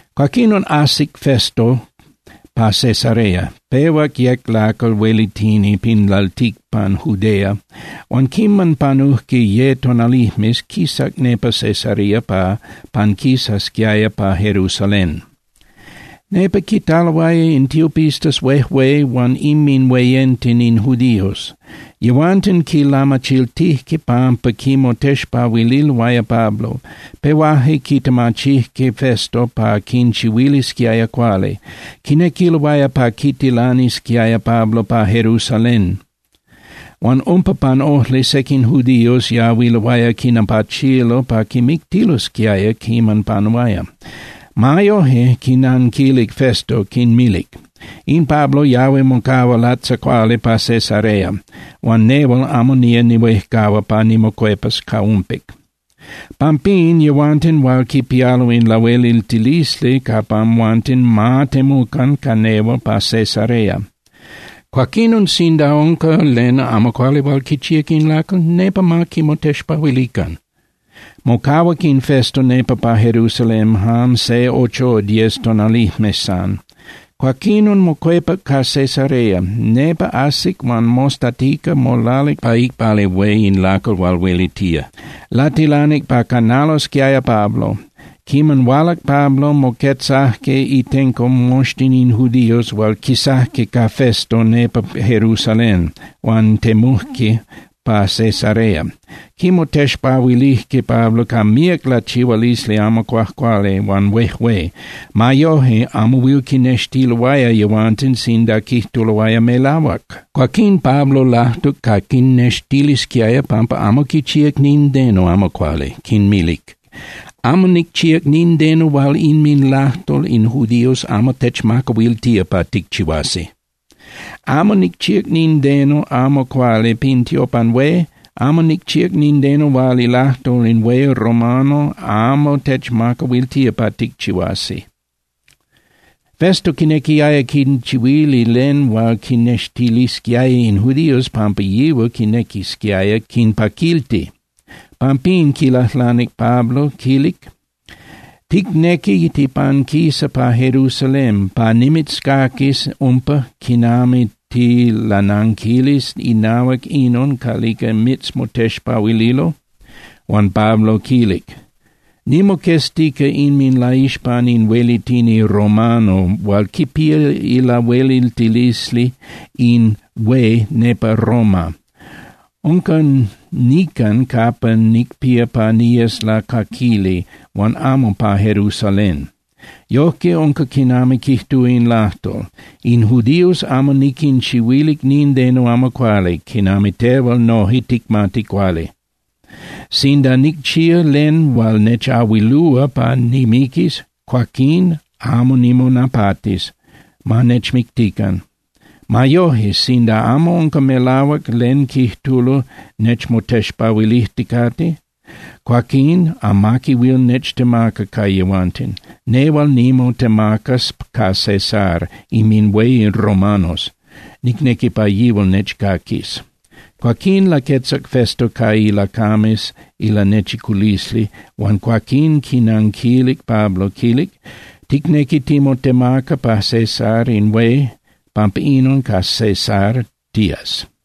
Cuaquinon ajsic Festo pa Cesarea, pehuac yec lacal huelitini pin lalticpan Judea huan quiman panujque ye tonalijmes, quisac nepa Cesarea pa panquisasquiaya pa Jerusalén. Nepa quitaloaya in tiopistas huejué huan inminhueyenten in judíos. Yehuanten quilamachiltijque pampa quimotexpahuililoaya Pablo, pehuajque quitemachijque Festo pa quinchihuilisquiaya cuali. Quinequiloaya pa quitilanisquiaya Pablo pa Jerusalén. Huan umpa pan ojli sequin judíos yahuiloaya quinapachilo pa quimictilosquiaya quiman panuaya. Ma yoje, quinnanquilic Festo, quinmilic: —In Pablo yahui mocahua latzacuali pa Cesarea, huan nehual amo nía nihuejcahua pa nimocuepas ca umpic. Pampín, yehuanten hual quipialo in lahueliltilisli capa amhuanten ma temucan ca nehual pa Cesarea. Cuaquinon sinda unca len amo cuali hual quichíac in lacal, nepa ma quimotexpahuilican. Mocahuac in Festo nepa pa Jerusalén jan se ocho o diez tonalijmes san, cuaquinon mocuepac pa Cesarea. Nepa ajsic huan mostatica molalic pa iicpali hué in lacal hual huelitía, latilanic pa canalosquiaya Pablo. Quiman hualac Pablo, moquetzajque itenco moxtin in judíos hual quisajque ca Festo nepa Jerusalén huan temujque pa Cesarea. Quimotexpahuilijque Pablo ca míac lachihualisli amo cuajcuali huan huejué. Ma yoje, amo huil quinextiloaya yehuanten sinda quijtuloaya melahuac. Cuaquín Pablo lajtuc pa quinnextilisquiaya pampa amo quichíac nindeno amo cuali, quinmilic: —Amo nicchíac nindeno hual inminlajtol in judíos amo techmacahuiltía pa ticchihuasi. Amo nicchíac nindeno amo cuali pin tiopan hué, amo nicchíac nindeno hual ilajtol in hué romano amo techmacahuiltía pa ticchihuasi. Festo quinequiaya quinchihuili len hual quinnextilisquiaya in judíos pampa yihual quinequisquiaya quinpaquilti. Pampín quilajlanic Pablo, quilic: —¿Ticnequi tipanquisa pa Jerusalén, pa nimitzcaquis umpa quinami tilananquilis inahuac inon calica mitzmotexpahuililo? Huan Pablo quilic: —Nimoqueztica inminlaixpan in huelitini romano hual quipía ilahueliltilisli in hué nepa Roma. Unca nican capa nicpía pa niyes lacaquili huan amo pa Jerusalén. Yojque unca quinami quijtúa in lajtol. In judíos amo niquinchihuilic nindeno amo cuali, quinami tehual noje ticmati cuali. Sinda nicchíac len hual nechahuilúa pa nimiquis, cuaquín amo nimonapatis, ma nechmictican. Ma yoje, sinda amo unca melahuac len quijtulo nechmotexpahuilijticate, cuaquín amaqui huil nechtemaca ca yehuanten. Nehual nimotemacas ca Cesar inminhué in romanos, nicnequi pa yihual nechcaquis. Cuaquín laquetzac Festo ca ilacames ilanechiculisli, huan cuaquín quinanquilic Pablo, quilic: —Ticnequi timotemaca ca Cesar in hué. Pampa inon, ca Cesar tías.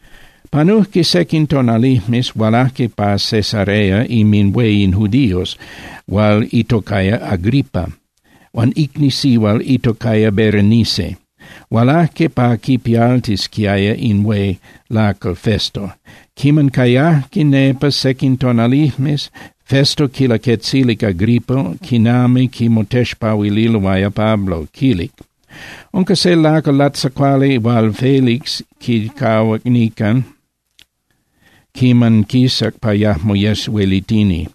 Panujque sequin tonalijmes, hualajque pa Cesarea inminhué in judíos hual itocaya Agripa huan icni sihual itocaya Berenice, hualajque pa quipialtisqui in hué lacal Festo. Quiman cayajque nepa sequin tonalijmes, Festo quilaquetzilic Agripa quinami quimotexpahuililoaya Pablo, quilic: —Unca se lacal latzacuali hual Félix quicahuac nican quiman quisac pa yajmo yes huelitini.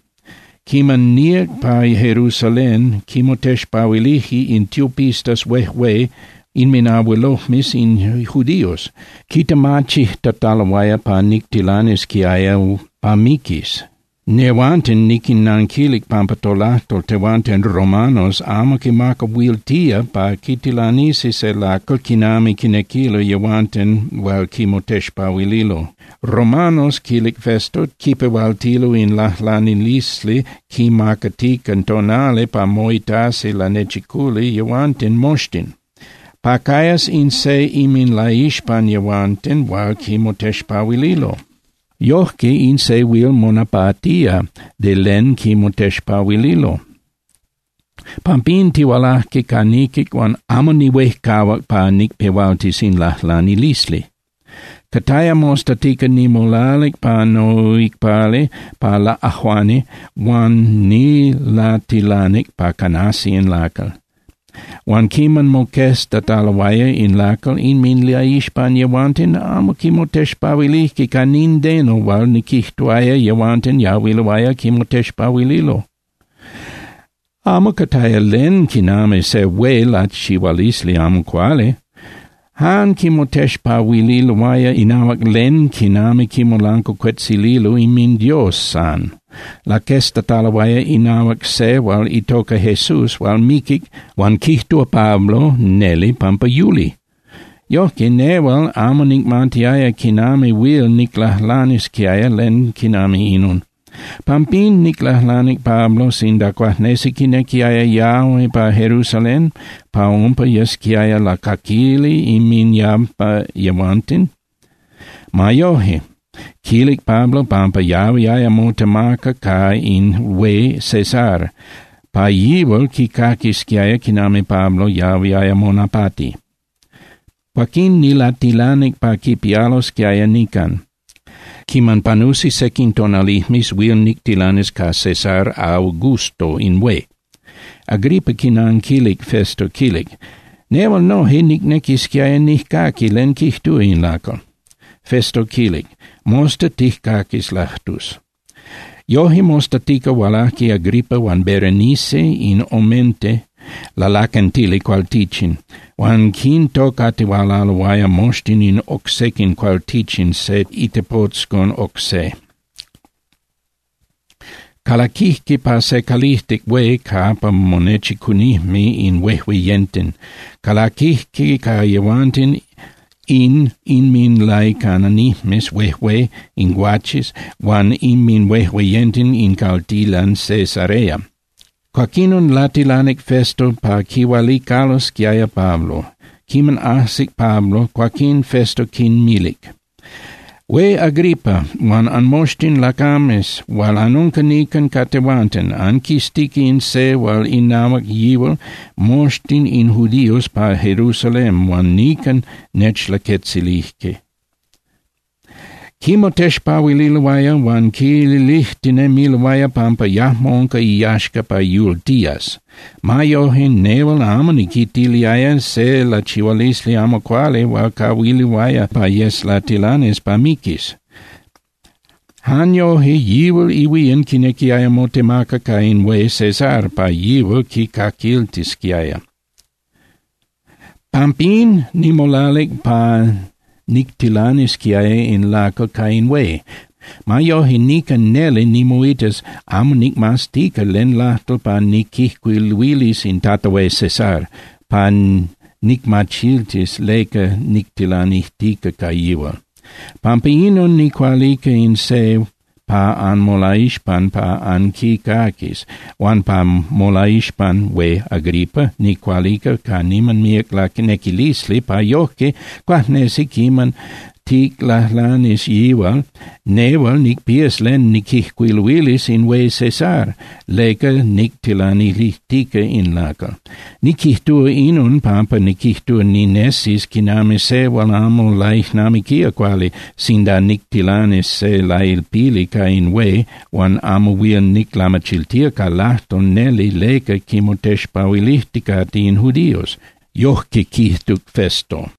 Quiman níac pa Jerusalén, quimotexpahuilije in tiopistas huejué huan inminabuelojmes in judíos, quitemachijtataloaya pa nictilanisquiaya pa miquis. Yehuanten niquinnanquilic pampa tolajtol tehuanten romanos amo quimacahuiltía pa quitilanisi se lacal quinami quinequilo yehuanten hual quimotexpahuililo. Romanos —quilic Festo—, quipehualtilo in lajlanilisli quimacatica tonali pa moitasi lanechiculi yehuanten moxtin, pa cayas in se inminlaixpan yehuanten hual quimotexpahuililo. Yojque in se huil monapatía de len quimotexpahuililo. Pampín tihualaje ca niquic huan amo nihuejcahuac pa nicpehualtis in lajlanilisli. Cataya mostatica nimolalic pa noicpali pa laꞌajuani huan nilatilanic pa canasi in lacal. Huan quiman moqueztataloaya in lacal inminlaixpan yehuanten, amo quimotexpahuilijque ca nindeno hual niquijtuaya yehuanten yahuiloaya quimotexpahuililo. Amo cataya len quinami se hué lachihualisli amo cuali. Jan quimotexpahuililoaya inahuac len quinami quimolancuacuetzililo inminDios san. Laqueztataloaya inahuac se hual itoca Jesús hual miquic, huan quijtúa Pablo neli pampa yuli. Yojque nehual amo nicmatiaya quinami huil niclajlanisquiaya len quinami inon. Pampín niclajlanic Pablo sinda cuajnesi quinequiaya yahui pa Jerusalén, pa umpa yesquiaya lacaquili inminyampa yehuanten. Ma yoje, quilic Pablo pampa yahuiaya motemaca ca in hué Cesar pa yihual quicaquisquiaya quinami Pablo yahuiaya monapati. Cuaquín nilatilanic pa quipialosquiaya nican. Quiman panusi sequin tonalijmes huil nictilanis ca Cesar Augusto in hué. Agripa quinanquilic Festo, quilic: —Nehual noje nicnequisquiaya nijcaqui len quijtúa in lacal. Festo quilic: —Mosta tijcaquis lajtus. Yojque mostatica hualajque Agripa huan Berenice in omente lalaquentili cualtichin, huan quintocatihualaloaya moxtin oc sequin cualtichin se itepotzcon oc se. Calaquijque pa se calijtic hué capa monechicunijme in huejueyenten. Calaquijque ca yehuanten in inminlaicananijmes huejué in guaches huan inminhuejueyenten in caltilan Cesarea. Cuaquinon latilanic Festo pa quihualicalosquiaya Pablo. Quiman ajsic Pablo, cuaquín Festo quinmilic: —Hué Agripa huan anmoxtin lacames hual anunca nican ca tehuanten, anquiztica in se hual inahuac yihual moxtin in judíos pa Jerusalén huan nican nechlaquetzilije. Quimotexpahuililoaya huan quilijtinemiloaya pampa yajmo unca iyaxca pa yultías. Ma yoje, nehual amo niquitiliaya se lachihualisli amo cuali hual cahuiluaya pa yes latilanis pa miquis. Jan yoje yihual ihuían quinequiaya motemaca ca in hué Cesar pa yihual quicaquiltisquiaya. Pampín nimolalic pa nictilanisquiaya in lacal ca in hué. Ma yoje, nican neli nimoitas amo nicmaztica len lajtol pa niquijcuiluilis in Tata Hué Cesar pa nicmachiltis leca nictilanijtica ca yihual. Pampa inon nicualica in se pa anmolaixpan pa anquicaquis. Huan pa molaixpan, Hué Agripa, nicualica ca niman míac lanequilisli pa yojque, cuajnesi quiman ticlajlanis yihual, nehual nicpías len niquijcuiluilis in hué Cesar leca nictilanilijtica in lacal. Niquijtúa inon pampa niquijtúa ninesis quinami se hual amo laijnamiquía cuali sinda nictilanis se lailpili ca in hué huan amo huil niclamachiltía ca lajtol neli leca quimotexpahuilijticate in judíos. Yojque quijtuc Festo.